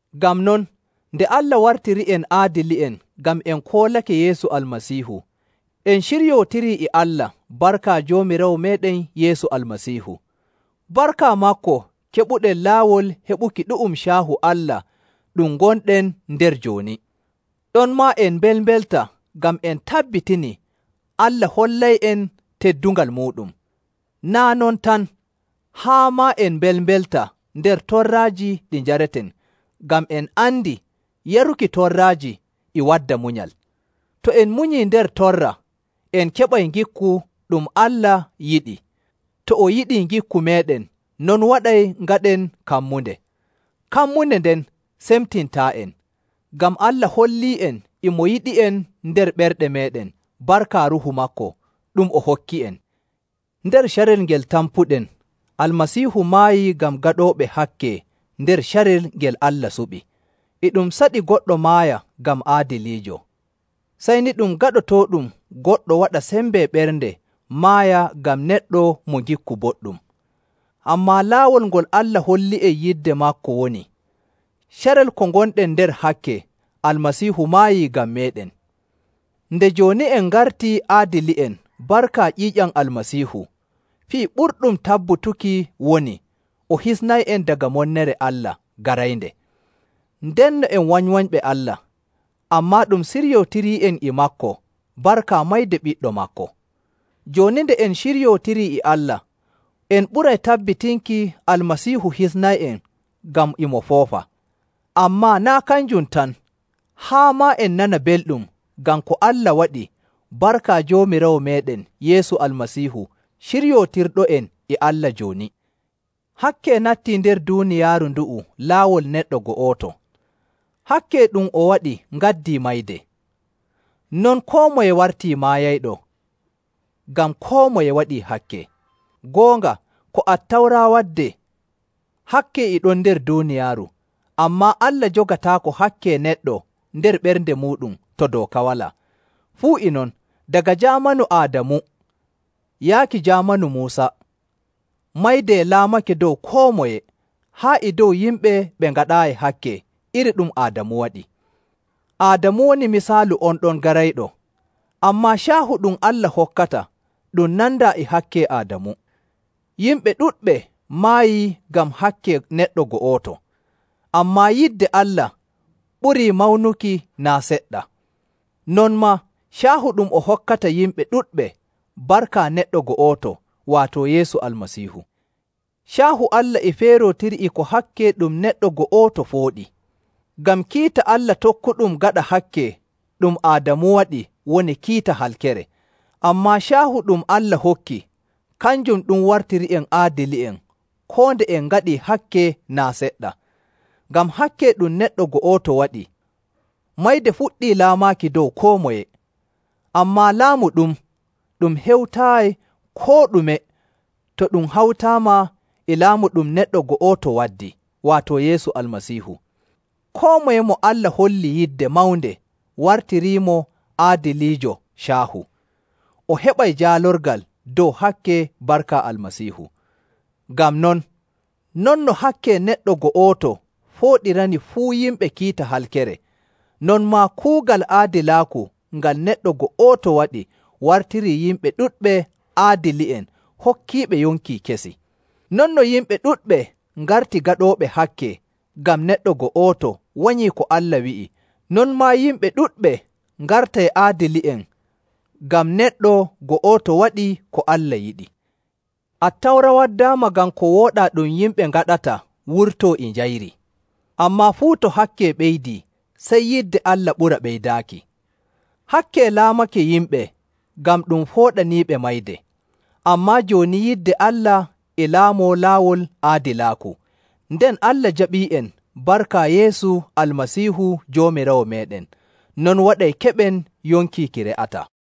Ngam non, nde Allah wartiri'en aadili'en ngam en koolake Yeesu Almasiihu, en ciryootirii e Allah barka Joomiraawo meeɗen Yeesu Almasiihu. Barka maako keɓuɗen laawol heɓuki ɗu'um caahu Allah ɗum gonɗen nder jooni. Ɗonmaa en mbelmbelta ngam en tabbitinii Allah hollay'en teddungal muuɗum. Naa' non tan, haa maa en mbelmbelta nder torraaji ɗi njareten, ngam en andi yaruki torraaji e wadda munyal. To en munyii nder torra, en keɓay ngikku ɗum Allah yiɗi, to o yiɗii ngikku meeɗen, non waɗay ngaɗen kammunde. Kammunde nden semtintaa'en, ngam Allah holli'en e mo yiɗi'en nder ɓerɗe meeɗen barka Ruuhu maako, ɗum o hokki'en. Nder carel ngel tampuɗen, Almasiihu maayii ngam gaɗooɓe hakke nder carel ngel Allah suɓi. E ɗum saɗi goɗɗo maaya ngam aadiliijo. Sey ni ɗum gaɗotooɗum goɗɗo waɗa sembe ɓernde maaya ngam neɗɗo mo ngikku boɗɗum. Ammaa laawol ngol Allah hollii'en yidde maako woni, carel ko ngonɗen nder hakke, Almasiihu maayii ngam meeɗen. Nde jooni en ngartii aadili'en barka ƴiiƴam: Waato mayde maako. Almasiihu, fii ɓurɗum tabbutuki woni o hisnay'en daga monnere Allah garaynde. Ndenno en wanywanyɓe Allah, ammaa ɗum siryootirii'en e maako barka mayde ɓiɗɗo maako. Jooni nde en ciryootirii e Allah, en ɓuray tabbitinki Almasiihu hisnay'en ngam e mo foofa. Ammaa naa' kanjum tan, haa maa en nana belɗum ngam ko Allah waɗi barka Joomiraawo meeɗen Yeesu Almasiihu, ciryootirɗo'en e Allah jooni. Hakke nattii nder duuniyaaru ndu'u laawol neɗɗo go'oto. Hakke ɗum o waɗi ngaddii mayde. Non koo moye wartii maayayɗo, ngam koo moye waɗii hakke.. Goonga, ko Attawra waddee, hakke e ɗon nder duuniyaaru, ammaa Allah jogataako hakke neɗɗo nder ɓernde muuɗum to dooka walaa. Fuu e non, daga jaamanu Aadamu yaaki jaamanu Muusa, mayde laamake dow koo moye, haa e dow yimɓe ɓe ngaɗaayi hakke iri ɗum Aadamu waɗi: Waato wanyuki ko Allah wi'imo.. Aadamu woni misaalu on ɗon garayɗo. Ammaa caahu ɗum Allah hokkata ɗum nandaa e hakke Aadamu. Yimɓe ɗuɗɓe maayii ngam hakke neɗɗo go'oto, ammaa yidde Allah ɓurii mawnuki naa' seɗɗa, non maa caahu ɗum o hokkata yimɓe ɗuɗɓe barka neɗɗo go'oto, waato Yeesu Almasiihu. Caahu Allah e feerootiri e ko hakke ɗum neɗɗo go'oto fooɗi. Ngam kiita Allah tokkuɗum gaɗa hakke ɗum Aadamu waɗi woni kiita halkere, ammaa caahu ɗum Allah hokki, kanjum ɗum wartiri'en aadili'en koo nde en ngaɗii hakke naa' seɗɗa. Ngam hakke ɗum neɗɗo go'oto waɗi, mayde fuɗɗi laamaaki dow koo moye. Ammaa laamu ɗum, ɗum hewtaayi koo ɗume to ɗum hawtaama e laamu ɗum neɗɗo go'oto waddi, waato Yeesu Almasiihu. Koo moye mo Allah holli yidde mawnde wartiriimo aadiliijo caahu, o heɓay jaalorgal dow hakke barka Almasiihu. Ngam non, non no hakke neɗɗo go'oto fooɗirani fuu yimɓe kiita halkere, non maa kuugal aadilaaku ngal neɗɗo go'oto waɗi wartirii yimɓe ɗuɗɓe aadili'en hokkiiɓe yonki kesi. Non no yimɓe ɗuɗɓe ngarti gaɗooɓe hakke ngam neɗɗo go'oto wanyii ko Allah wi'i, non maa yimɓe ɗuɗɓe ngartay aadili'en ngam neɗɗo go'oto waɗii ko Allah yiɗi. Attawra waddaama ngam ko wooɗaa ɗum yimɓe ngaɗata wurtoo e njayri. Ammaa fuu to hakke ɓeydii, sey yidde Allah ɓura ɓeydaaki. Hakke laamake yimɓe ngam ɗum pooɗaniiɓe mayde. Ammaa jooni yidde Allah e laamoo laawol aadilaaku, nden Allah jaɓii'en barka Yeesu Almasiihu Joomiraawo meeɗen. Non waɗay keɓen yonki ki re'ataa.